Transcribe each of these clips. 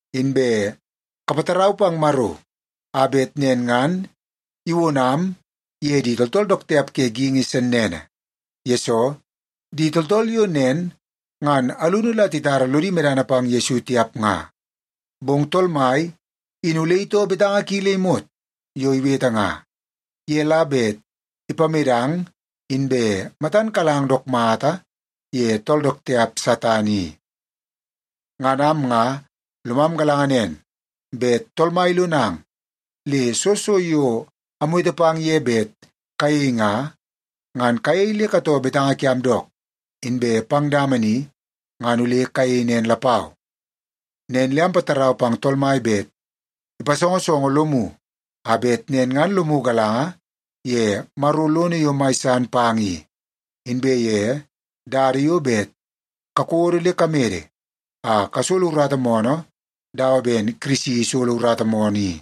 Inbe kapatarau pang Maro a bet nen ngan iwonam ye di tooltool dook tiap ke geingi sennene. Yesoo, di tooltool yo nen ngan alunu la titara lodi medana pang Yesu tiap nga. Bong Tool Mai in ole itoo betanga ki le imot yo iwete nga. Ye la bet ipamedang inbe matan kalang dook mata ye tool dook tiap Satan i. Ngan am nga lomam galanga nen bet Tool Mai ilonang le soo so yo amwete pang ye bet kayei nga, ngan kayei le katoo betanga kiam dook, inbe pang dama ni ngan ole kayei nen lapau. Nen le ampatarau pang Tool Mai bet ipasongosongo lomu a bet nen ngan lomu galanga ye Maro lono yo mai san pang i, inbe ye dada yo bet kakodo le kamede a kasolo urata moonoo dawa ben Kirisi isolo urata moonoo i.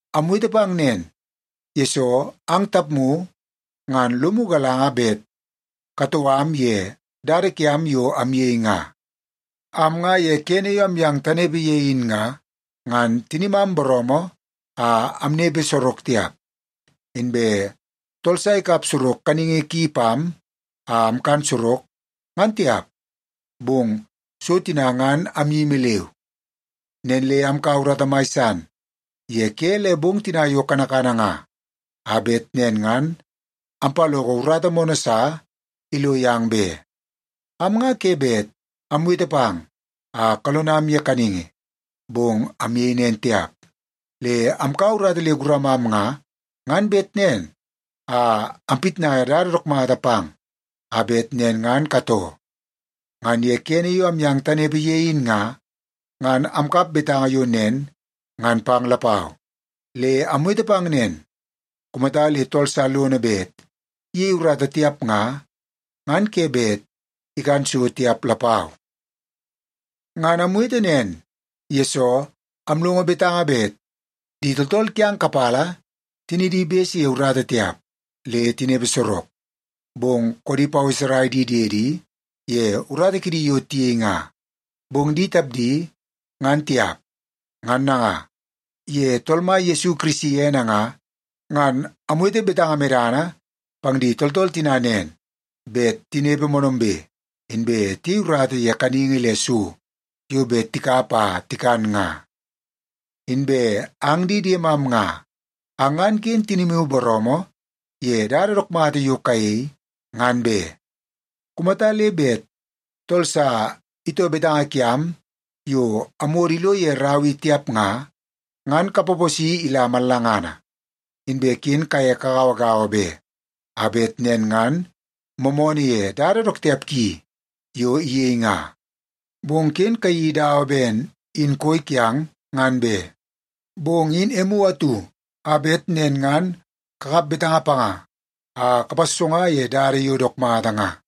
Amwete pang nen, yesoo ang tapmu ngan lomu galanga bet katoo am ye dada kiam yo amyei nga. Am nga ye kene yo amyang tanepe ye in nga, ngan tinimam booroomoo a amnepe sorok tiap, inbe tool sa ikap sorok kaningi ki pam a amkan sorok, ngan tiap. Bong so tina ngan amyimi leu. Nen le amkaua urata mai san ye ke le bong tina yo kanakana nga a bet nen ngan ampaloko urata moonoo sa ilo yang be. Am nga ke bet amwete pang a kalonam ye kaningi, bong amyei nen tiap. Le amkaua urata le guramam nga, ngan bet nen a ampitnai dada dook mata pang a bet nen ngan katoo. Ngan ye kene yo amyang tanepe ye in nga, ngan amkap betanga yo nen ngan pang lapau. Le amwete pang nen, “Kumata le tool sa lono bet iyei urata tiap nga, ngan ke bet ikan so tiap lapau.” Ngan amwete nen, yesoo amlongo betanga bet di tooltool kiang kapala tinidi bese ye urata tiap le tinepe sorok, bong koodi paweserai di diedi ye urata kidi yo tiyei nga. Bong di tapdi ngan tiap. Ngan nanga, ye Tool Mai Yesu Kirisi ene nga, ngan amwete betanga medana pang di tooltool tina nen bet tinepe moonoombe, inbe tiyei urata ye kaningi le so yo bet tikap a tikan nga. Inbe ang di diemam nga, ang ngan ken tinimu booroomoo ye dada dook mata yo kayei, ngan be. Kumata le bet tool sa itoo betanga kiam yo amwodo ilo ye rau i tiap nga, ngan kapaposi ila mallangana. Inbe ken kaye kagauagaua be, a bet nen ngan moomoonoo ye dada dook tiap ki yo iyei nga. Bong ken kayeii dawa ben in koi kiang ngan be. Bong in emu atu a bet nen ngan kakap betanga panga a kapassonga ye dada yo dook mata nga.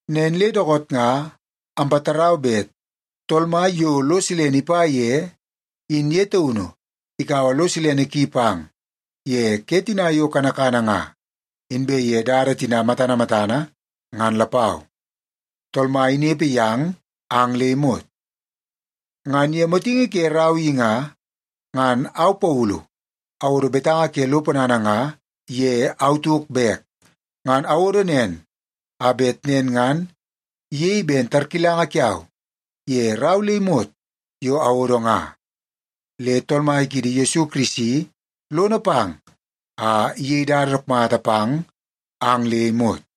Nen le dookoot nga ampatarau bet Tool Mai yo lo silene ipa ye, in ye taunu ikaua lo silene ki pang ye ke tina yo kanakana nga, inbe ye dada tina matana matana ngan lapau. Tool Mai inepe yang ang le imot. Ngan ye motingi ke rau i nga, ngan au Paulu awodo betanga ke lo ponana nga ye au tauk bek. Ngan awodo nen a bet nen ngan iyei ben tarkilanga kiau ye rau le imot yo awodo nga. Le Tool Mai kiidi Yesu Kirisi lono pang a iyei dada dook mata pang ang le imot.